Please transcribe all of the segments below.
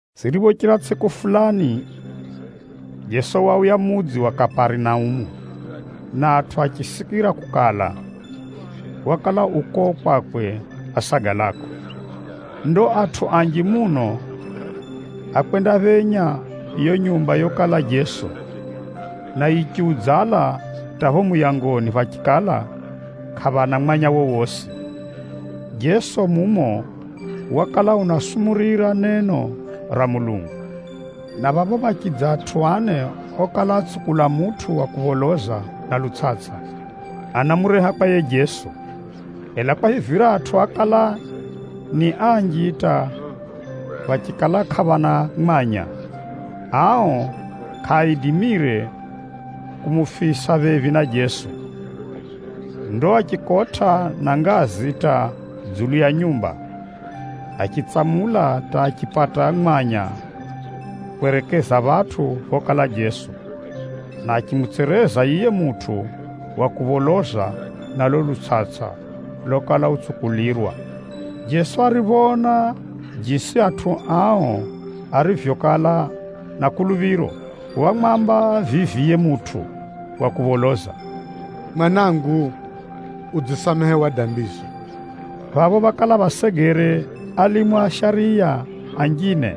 Ziriphochira tsʼiku fulani, Jeso wauya mudzi wa Kaparinaumu, na atʼu achisikira kukala, wakala u kuko kwakwe asagalako. Ndo atʼu anji muno ákwendaphenya yiyo nyumba yokala Jeso, na yichiudzala hata pho muyangoni phachikala kʼaphana mwanya wowosi. Jeso mumo wakala unaasumurira neno ra Mulungu, na phapho phachidza atʼu ane okala atsukula mutʼu wa kupholoza na lutsʼatsʼa, anamureha kwa yiye Jeso. Ela kwahivira atʼu ákala ni anji hata phachikala kʼaphana mwanya, ao kʼaaidimire kumufisa phephi na Jeso. Ndo achikotʼa na ngazi hata dzulu ya nyumba, achitsamula hata achipata mwanya kwerekeza phatʼu phokala Jeso, na achimutsereza yiye mutʼu wa kupholoza na lulo lutsʼatsʼa lokala utsukulirwa. Jeso ariphoona jisi atʼu ao arivyokala na kuluphiro, wamwamba vivi yiye mutʼu wa kupholoza, “Mwanangu, udzisamehewa dambizo.” Phapho phakala phasegere alimu a shariya anjine,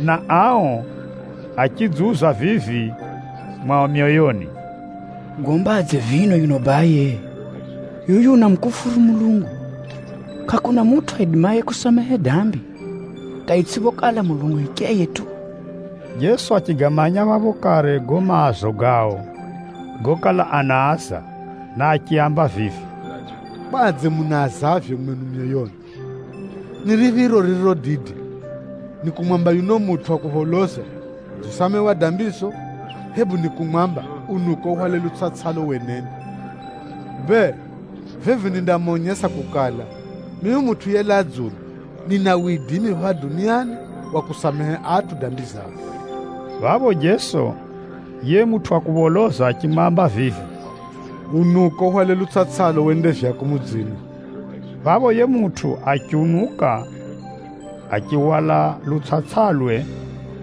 na ao achidziuza vivi mwao myoyoni, “Ugombadze vino yuno baye? Yuyu unamukufuru Mulungu! Kʼakuna mutʼu aidimaye kusamehe dambi, hata itsʼiphokala Mulungu hicheye tu!” Jeso achigamanya phapho kare gago maazo gao gokala anaaza, na achiaamba vivi, “Kwadze munaazavyo mwenu myoyoni? Ni riphiro ririro dide, ni kumwamba yuno mutʼu wa kupholoza, ‘Udzisamehewa dambizo,’ hebu ni kumwamba, ‘Unuka uhwale lutsʼatsʼalo wenende?’ Bee, vivi nindamonyesa kukala, mimi Mutʼu yelaa dzulu, nina widimi phapha duniani wa kusamehe atʼu dambi zao.” Phapho Jeso, achimwamba yiye mutʼu yekala upholoza vivi, “Unuka uhwale lutsʼatsʼalo wende vyako mudzini.” Phapho yiye mutʼu achiunuka, achihwala lutsʼatsʼalwe,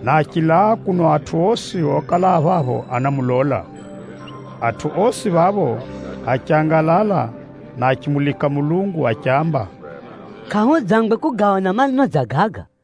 na achilaa na kuno atʼu osi okala a phapho anamulola. Atʼu osi phapho achangalala na achimulika Mulungu achiamba, “Kʼahudzangwe kugaona maneno dza gaga!”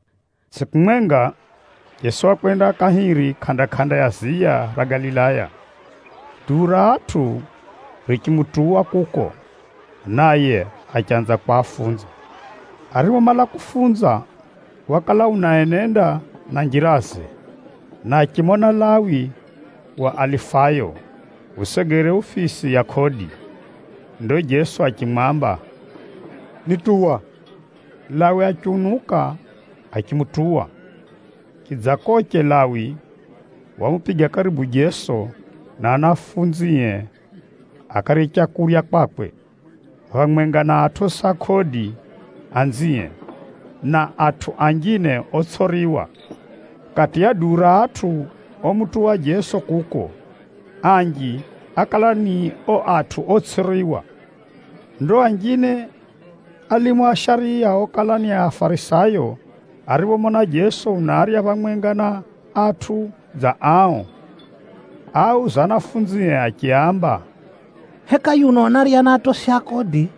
Tsʼiku mwenga, Jeso wakwenda kahiri kʼanda-kʼanda ya ziya ra Galilaya. Duu ra atʼu richimutuwa kuko, naye achanza kwafunza. Ariphomala kufunza, wakala unaenenda na njiraze, na achimona Lawi wa Alifayo usegere ufisi ya kodi. Ndo Jeso achimwamba, “Nituwa!” Lawi achiunuka achimutuwa. Chidzakoche, Lawi wamupiga karibu Jeso na anafunzie akarye leu kwakwe, phamwenga na atosi a kodi anzie, na atʼu anjine otsʼiriwa. Chiyunani chinaamba adambi. (Kati ya duu ra atʼu omutuwa Jeso kuko, anji ákala ni ao atʼu otsʼiriwa.) Ndo anjine a alimu a shariya okala ni Afarisayo ariphomona Jeso unarya phamwenga na atʼu dza ao, áauza anafunzie achiaamba, “Heka yuno unarya na atosi a kodi,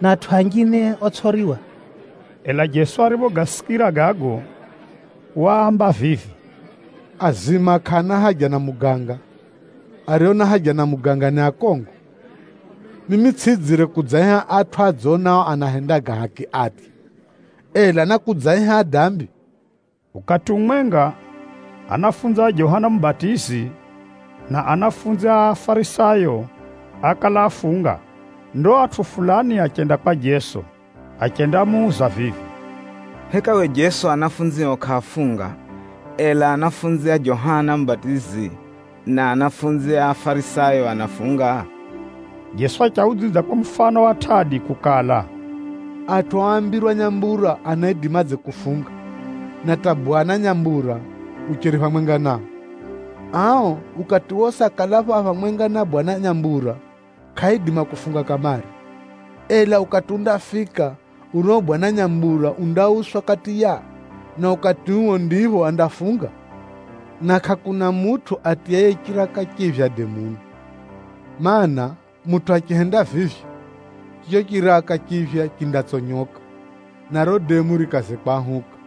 na atʼu anjine otsʼiriwa?” Ela Jeso ariphogasikira gago, waamba vivi, “Azima kʼaana haja na muganga, ario na haja na muganga ni akongo. Mimi tsʼidzire kudzaaiha atʼu adzonao anahenda ga haki atye, ela, nákudzaaiha adambi.” Ukati umwenga, anafunzi a Johana Mubatizi, na anafunzi a Afarisayo ákala afunga. Ndo atʼu fulani achenda kwa Jeso, achendamuuza vivi, “Heka we Jeso anafunzio kʼaafunga, ela anafunzi a Johana Mubatizi na anafunzi a Afarisayo anafunga?” Jeso achiaudzidza kwa mufano wa tʼadi kukala, “Atʼu oambirwa nyambura anaidimadze kufunga, na hata bwana nyambura ucheri phamwenga nao? Ao, ukati wosi akalapho a phamwenga na bwana nyambura, kʼaaidima kufunga kamare. Ela ukati undafika, urio bwana nyambura undauswa kati yao, na ukati uo ndipho andafunga. “Na kʼakuna mutʼu atiyaye chiraka chiphya demuni. Maana, mutʼu achihenda vivyo, chicho chiraka chiphya chindatsonyoka, na riro demu rikaze kwahuka.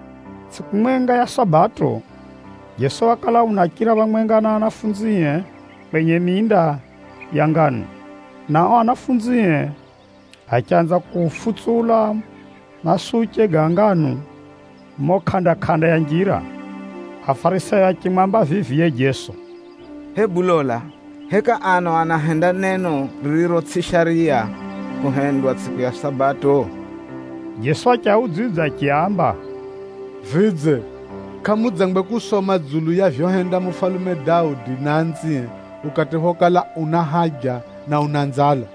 Tsʼiku mwenga ya Sabato, Jeso wakala unachira phamwenga na anafunzie kwenye minda ya nganu, na ao anafunzie achanza kufutsula masuche ga nganu mumo kʼanda-kʼanda ya njira. Afarisayo achimwamba vivi yiye Jeso, “Hebu lola! Heka ano anafunzio anahenda neno ririro tsʼi shariya kuhendwa tsʼiku ya Sabato?” Jeso achiaudzidza achiaamba, “Vidze, kʼamudzangwe kusoma dzulu ya vyohenda mufalume Daudi na anzie ukati phokala ana nzala na anahenza leu?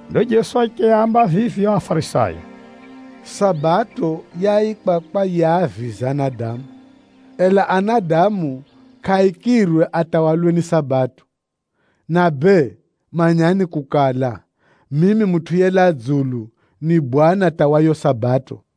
Ndo Jeso achiaamba vivi ao Afarisayo, “Sabato yaikwa kwa yiaavize anadamu, ela anadamu kʼaaikirwe atawalwe ni Sabato. Na bee, manyani kukala, mimi Mutʼu yelaa dzulu, ni Bwana hata wa yiyo Sabato.”